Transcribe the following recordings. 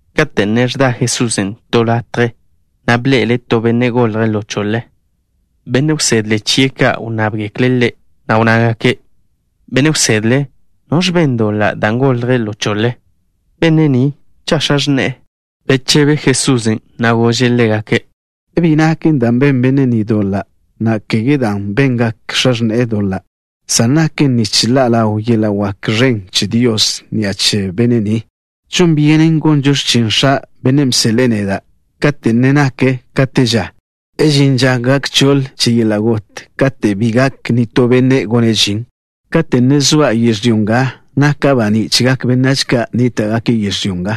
Kate' ne ẕda Jesusen' to latje, bḻe'ele' to benne' golje' ḻo choḻe. Benne' wsedle chie' ka' wnnábgekle' Ḻe', na' wnnágake': —Benne' Wsedle, ¿noẕ ben doḻa', dan' golje' ḻo choḻe? ¿Benne' ni, cha' x̱a x̱ne'e? Bechebe Jesusen', na' gože' ḻégake': —Bi naken dan' ben benne' ni doḻa', na' kege dan' bengak x̱a x̱ne'e doḻa', san naken nich ḻa' ḻaw yeḻa' wak ẕen che Dios ni'a che benne' ni. Žon byenen gonžo x̱chin X̱a', Bennen' bseḻe'e neda', kate' ne nak ka te ža. Žin ža gak choḻ che yeḻa' got, katen' bi gak nitó benne' gone' žin. Kate' ne zoa' yežlyó nga, naka' baní' chegak benách ka' nníta'gake' yežlyó nga.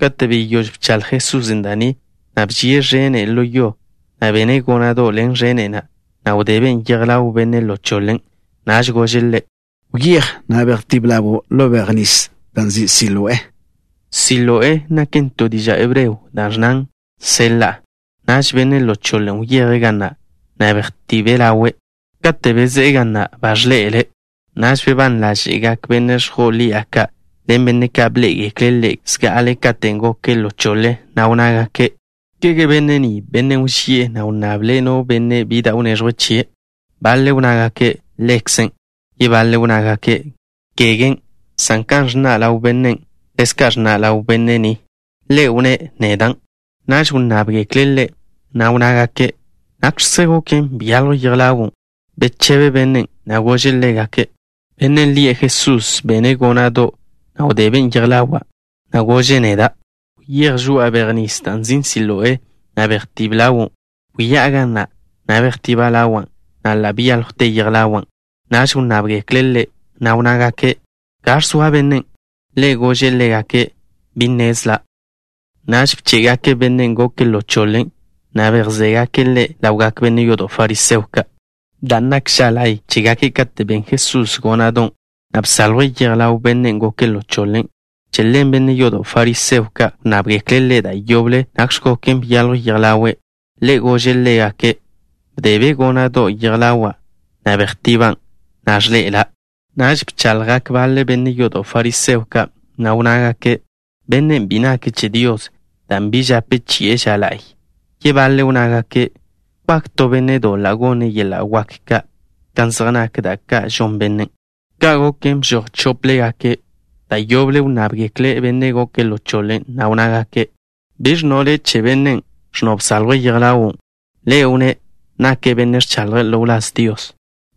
Kate' beyóž bchaḻj Jesusen' da' ni, bži'e ẕene' ḻo yo, na' bene' góna'do' ḻen ẕene' na', na' wdeben' yej ḻaw benne' ḻo choḻen'. Naž gože' ḻe': —Wyéj, na' bejtíb ḻawo' ḻo bej nis da' nzin' Siloé. (Siloé naken to diža' hebreo da' ẕnnan: nseḻa'.) Naž benne' ḻo choḻen' wyeje' ga na', na' bejtibe' ḻawe'. Kate' bezé'e ga na', ba ẕḻe'ele'. Naž bebán ḻáže'gak benne' ẕjo'o ḻi'a ka', ḻen benne' ka' bḻé'egekle' ḻe' zga'ale katen' goke' ḻo choḻe, na' wnnágake': —¿Kege benne' ni bennen' wži'e, na' wnnable' no benne' bi da' wneẕjwe' chie'? Baḻe' wnnágake': —Ḻekze'. Yebaḻe' wnnágake': —Kegen', san kan ẕnna' ḻaw bennen', ḻezka' ẕnna' ḻaw benne' ni. Ḻe' wnné': —Nedan'. Naž wnnábgekle' ḻe', na' wnnágake': —¿Nakx̱kze goken, byaljw yej ḻawo'? Bechebe bennen', na' gože' ḻégake': —Bennen' lie' Jesús bene' góna'do', na' wdeben' yej ḻawa', na' gože' neda': “Wyéj žoa'a bej nis da' nzin' Siloé, na' bejtíb ḻawo'.” Wyá'a ga na', na' bejtiba' ḻawa', na' ḻa' byáljwte yej ḻawa'. Naž wnnábgekle' ḻe', na' wnnágake': —¿Gaẕ zoa bennen'? Ḻe' gože' ḻégake': —Bi nnezla'. Naž bché'gake' bennen' goke' ḻo choḻe, na' bejzégake' ḻe' ḻawgak benne' yodo' fariseo ka'. Dan' nak ža la'y chégake' kate' ben Jesusen' góna'don', na' bsaljwe' yej ḻaw bennen' goke' ḻo choḻe, che ḻen benne' yodo' fariseo ka' wnnábgekle' ḻe' da' yoble nakx̱ goken byaljw yej ḻawe'. Ḻe' gože' ḻégake': —Bdebe' góna'do' yej ḻawa', na' bejtiban', na' ẕḻe'ela'. Naž bchaḻjgak baḻe benne' yodo' fariseo ka', na' wnnágake': —Bennen' bi nake' che Dios, dan' bi žape chi'e ža la'y. Yebaḻe' wnnágake': —¿Wak to benne' doḻa' gone' yeḻa' wak ka' kan zej nak da' ka' žon bennen'? Ka' goken, bžoj chóplegake'. Da' yoble wnnábgekle' bennen' goke' ḻo choḻe, na' wnnágake': —¿Biẕ ẕnno' le' che bennen', ẕnno' bsaljwe' yej ḻawo'? Ḻe' wnné': —Nake' benne' ẕchaḻje' ḻo wláz Dios.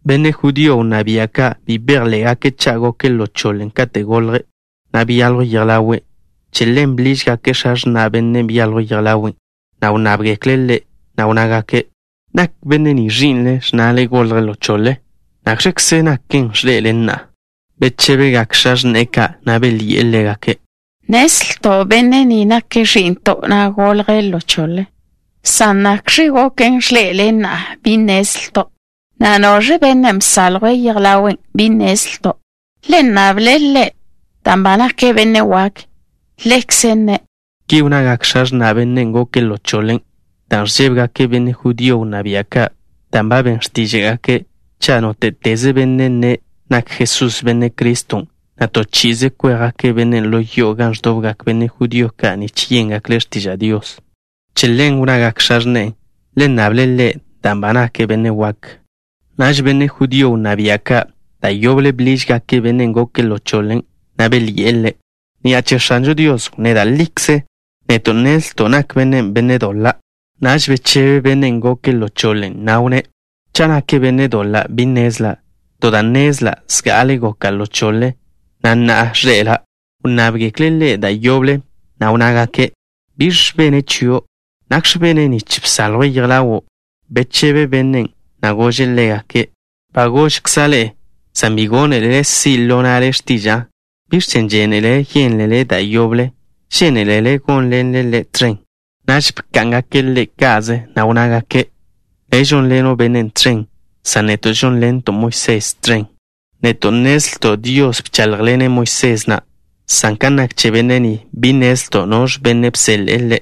Benne' judío wnná bia' ka' bi bejḻé'gake' cha' goke' ḻo choḻe katen' golje', na' byaljw yej ḻawe'. Che ḻen bḻížgake' x̱a x̱na' bennen' byaljw yej ḻawe'. Wnnábgekle' ḻégake', na' wnnágake': —¿Nak benne' ni ẕi'nle, ẕnnale golje' ḻo choḻe? ¿Nakx̱kze naken ẕḻe'ele' na'a? Bechébegak x̱a x̱ne'e ka', na' belyi'e ḻégake': —Nnezlto' benne' ni nake' ẕi'nto', na' golje' ḻo choḻe, san nakx̱ goken, ẕḻe'ele' na'a, bi nnezlto', na' noẕ bennen' bsaljwe' yej ḻawe', bi nnezlto'. Le nnable' ḻe', dan' ba nake' benne' wak. Ḻekze' nne'. Ki wnnagak x̱a x̱na' bennen' goke' ḻo choḻe, dan' ẕžébegake' benne' judío wnná bia' ka', dan' ba ben x̱tíža'gake' cha' nóte'teze benne' nne' nak Jesusen' Benne' Criston', to chi'ize kwéjgake' bennen' ḻo yo'o gan ẕdobgak benne' judío ka' nich yéngekle' x̱tiža' Dios. Che ḻen wnnagak x̱a x̱ne'e: “Le nnable' ḻe', dan' ba nake' benne' wak.” Naž benne' judío wnná bia' ka' da' yoble bḻížgake' bennen' goke' ḻo choḻe, na' belyi'e ḻe': —Ni'a che X̱anžo Dios wnné da' likze. Neto' nnezlto' nak bennen' benne' doḻa'. Naž bechebe bennen' goke' ḻo choḻe, na' wnné': —Cha' nake' benne' doḻa' bi nnezla'. To da' nnezla'. Zga'ale goka' ḻo choḻe, na' na'a ẕḻe'ela'. Wnnábgekle' ḻe' da' yoble, na' wnnágake': —¿Biẕ bene' chio'? ¿Nakx̱ bene' nich bsaljwe' yej ḻawo'? Bechebe bennen', na' gože' ḻégake': —Ba gožkza' ḻe'e, san bi gónelele si' ḻo na'le x̱tiža'a. ¿Biẕ chen' žénelele yénlele da' yoble? ¿Žénelele gónḻenle Ḻe' tẕen? Naž bká'ngake' ḻe' ka'ze, na' wnnágake': —Le' žónḻeno' bennen' tẕen, san neto' žónḻento' Moisés tẕen. Neto' nnezlto' Dios bcháḻjḻene' Moisés na', san kan nak che benne' ni, bi nnezlto' noẕ benne' bseḻe'e Ḻe'.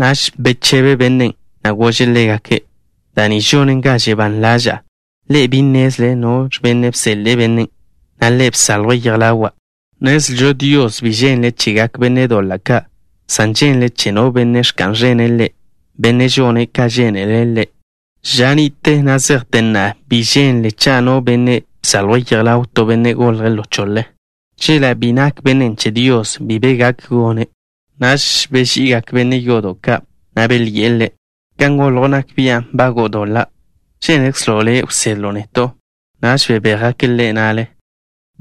Naž bechebe bennen', na' gože' ḻégake': —Da' ni žonen ga žebán ḻaža'a. Ḻe'e bi nnézlele noẕ benne' bseḻe'e bennen', na' Ḻe' bsaljwe' yej ḻawa'. Nnezlžo Dios bi ženle' chegak benne' doḻa' ka', san ženle' che no benne' ẕka'n ẕene' Ḻe', benne' žone' ka žénele' Ḻe'. Ža ni'te na' zejte na'a bi ženle cha' no benne' bsaljwe' yej ḻaw to benne' golje' ḻo choḻe. Chela' bi nak bennen' che Dios, bi be gak gone'. Naž beži'igak benne' yodo' ka', na' belyi'e ḻe': —Kan goljo' nak bian' nbago'o doḻa'. ¿Žénekzlo' le' wsedlo' neto'? Naž bebéjgake' ḻe' na'le.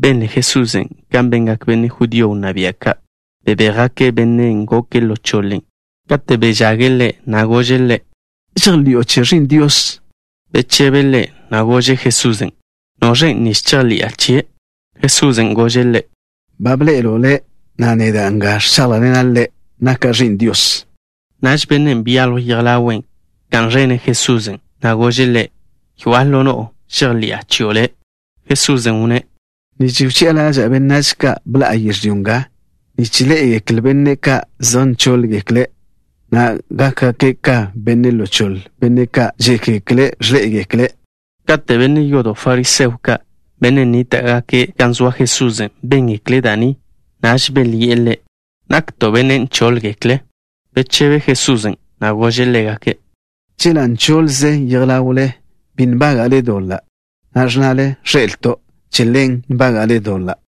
Benle Jesusen' kan bengak benne' judío wnná bia' ka', bebéjgake' bennen' goke' ḻo choḻe. Kate' bežage' ḻe', gože' ḻe': —¿Žejḻi'o che Ẕi'n Dios? Bechebe' ḻe', na' gože' Jesusen': —¿Noẕen', nich chejḻi'a chie'? Jesusen' gože' ḻe': —Ba bḻe'elo' ḻe', na' neda' nga ẕcháḻjḻena' le', naka' Ẕi'n Dios. Naž bennen' byaljw yej ḻawe', bka'n ẕene' Jesusen', na' gože' Ḻe': —Yoa'a ḻo no'o, žejḻi'a chio' Le'. Jesusen' wnné': —Nich wchi'a ḻaža'a benách ka', bḻa'a yežlyó nga, nich ḻé'egekle benne' ka' zej nchóḻgekle', na' gakgak ka benne' ḻo choḻe benne' ka' žékgekle' ẕḻé'egekle'. Kate' benne' yodo' fariseo ka', benne' nníta'gake' gan zoa Jesusen', béngekle' da' ni, naž belyi'e Ḻe': —¿Nakto' benne' nchóḻgekle'? Bechebe Jesusen', na' gože' ḻégake': —Chela' nchoḻze yej ḻawle, bi nbága'le doḻa'. Na'a ẕnnale: “Ẕḻé'elto'.” Che ḻen nbága'le doḻa'.